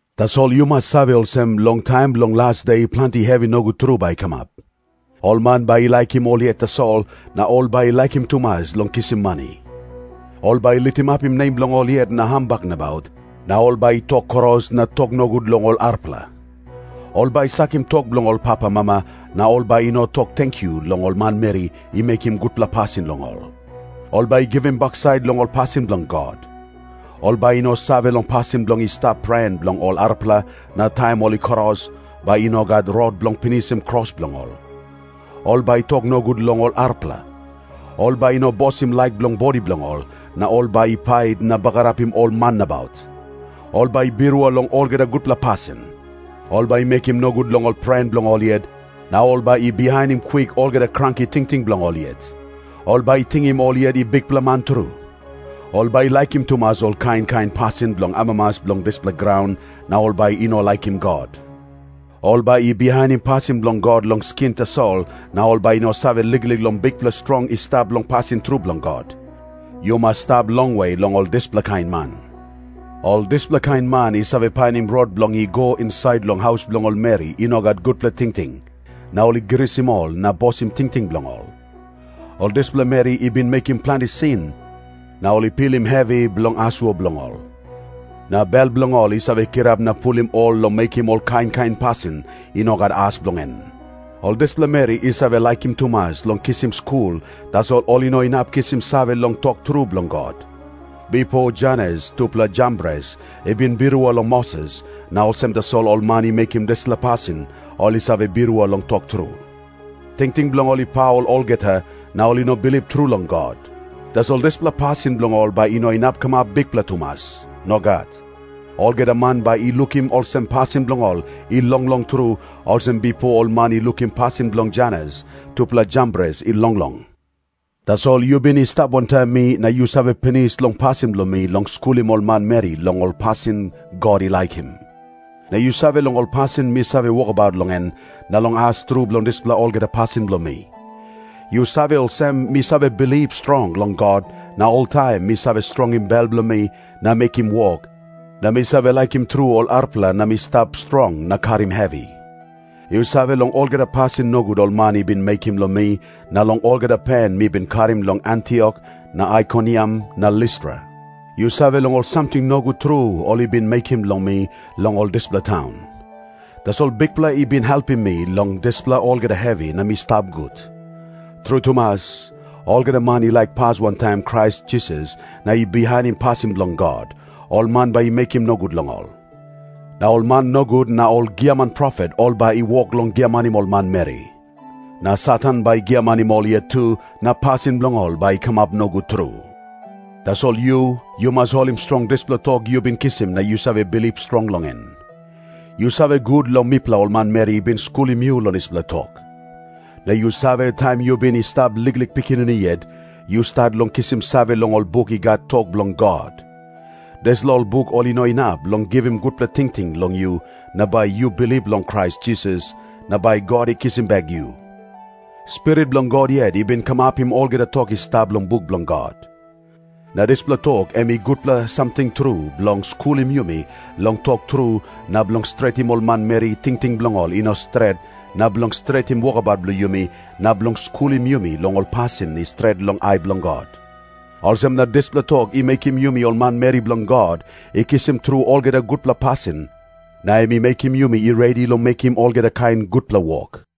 Tasol yu mas save olsem, long taim bilong las de planti hevi nogut tru bai i kamap. Ol man bai i laikim ol yet tasol, na ol bai i laikim tumas long kisim mani. Ol bai i litimapim nem bilong ol yet na hambak nabaut, na ol bai i tok kros na tok nogut long ol arapela. Ol bai i sakim tok bilong papamama, na ol bai i no tok tenkyu long ol manmeri i mekim gutpela pasin long ol. Ol bai i givim baksait long ol pasin bilong God. Ol bai i no save long pasin bilong i stap pren bilong ol arapela, na taim ol i kros, bai i no gat rot bilong pinisim kros bilong ol. Ol bai i tok nogut long ol arapela. Ol bai i no bosim laik bilong bodi bilong ol, na ol bai i pait na bagarapim ol man nabaut. Ol bai i birua long olgeta gutpela pasin. Ol bai i mekim nogut long ol pren bilong ol yet, na ol bai i bihainim kwik olgeta kranki tingting bilong ol yet. Ol bai i tingim ol yet i bikpela man tru. Ol bai i laikim tumas ol kain kain pasin bilong amamas bilong dispela graun, na ol bai i no laikim God. Ol bai i bihainim pasin bilong God long skin tasol na ol bai i no save liklik long bikpela strong i stap long pasin tru bilong God. Yu mas stap longwe long ol dispela kain man. Ol dispela kain man i save painim rot bilong i go insait long haus bilong ol meri i no gat gutpela tingting, na ol i grisim ol na bosim tingting bilong ol. Ol dispela meri i bin mekim planti sin, na ol i pilim hevi bilong asua bilong ol. Na bel bilong ol i save kirap na pulim ol long mekim ol kain kain pasin i no gat as bilong en. Ol dispela meri i save laikim tumas long kisim skul, tasol ol i no inap kisim save long tok tru bilong God. Bipo Janes tupela Jambres i bin birua long Moses, na olsem tasol ol man i mekim dispela pasin ol i save birua long tok tru. Tingting bilong ol i paul olgeta, na ol i no bilip tru long God. Tasol dispela pasin bilong ol bai i no kamap bikpela tumas. Nogat. Olgeta man bai i lukim olsem pasin bilong ol i longlong tru, olsem bipo ol man i lukim pasin bilong Janes tupela Jambres i longlong. Tasol yu bin i stap wantaim mi, na yu save pinis long pasin bilong mi long skulim ol manmeri long ol pasin God i laikim. Na yu save long ol pasin mi save wokabaut long en, na long as tru bilong dispela olgeta pasin bilong mi. Yu save olsem, mi save bilip strong long God, na oltaim mi save strongim bel bilong mi na mekim wok, na mi save laikim tru ol arapela na mi stap strong na karim hevi. Yu save long olgeta pasin nogut ol man i bin mekim long mi na long olgeta pen mi bin karim long Antiok na Aikoniam na Listra. Yu save long ol samting nogut tru ol i bin mekim long mi long ol dispela taun. Tasol Bikpela i bin helpim mi long dispela olgeta hevi na mi stap gut. Tru tumas, olgeta man i laik pas wantaim Krais Jisas na i bihainim pasin bilong God, ol man bai i mekim nogut long ol. Na ol man nogut na ol giaman profet ol bai i wok long giamanim ol manmeri. Na Satan bai i giamanim ol yet tu, na pasin bilong ol bai i kamap nogut tru. Tasol yu, yu mas holim strong dispela tok yu bin kisim na yu save bilip strong long en. Yu save gut long mipela ol manmeri i bin skulim yu long dispela tok. Na yu save, taim yu bin i stap liklik pikinini yet, yu stat long kisim save long ol buk i gat tok bilong God. Dispela ol buk ol inap long givim gutpela tingting long yu, na bai yu bilip long Krais Jisas, na bai God i kisim bek yu. Spirit bilong God yet i bin kamapim olgeta tok i stap long buk bilong God. Na dispela tok em i gutpela samting tru bilong skulim yumi long tok tru na bilong stretim ol manmeri tingting bilong ol i no stret na bilong stretim wokabaut bilong yumi na bilong skulim yumi long ol pasin i stret long ai bilong God. Olsem na dispela tok i mekim yumi ol manmeri bilong God i kisim tru olgeta gutpela pasin, na em i mekim yumi i redi long mekim olgeta kain gutpela wok.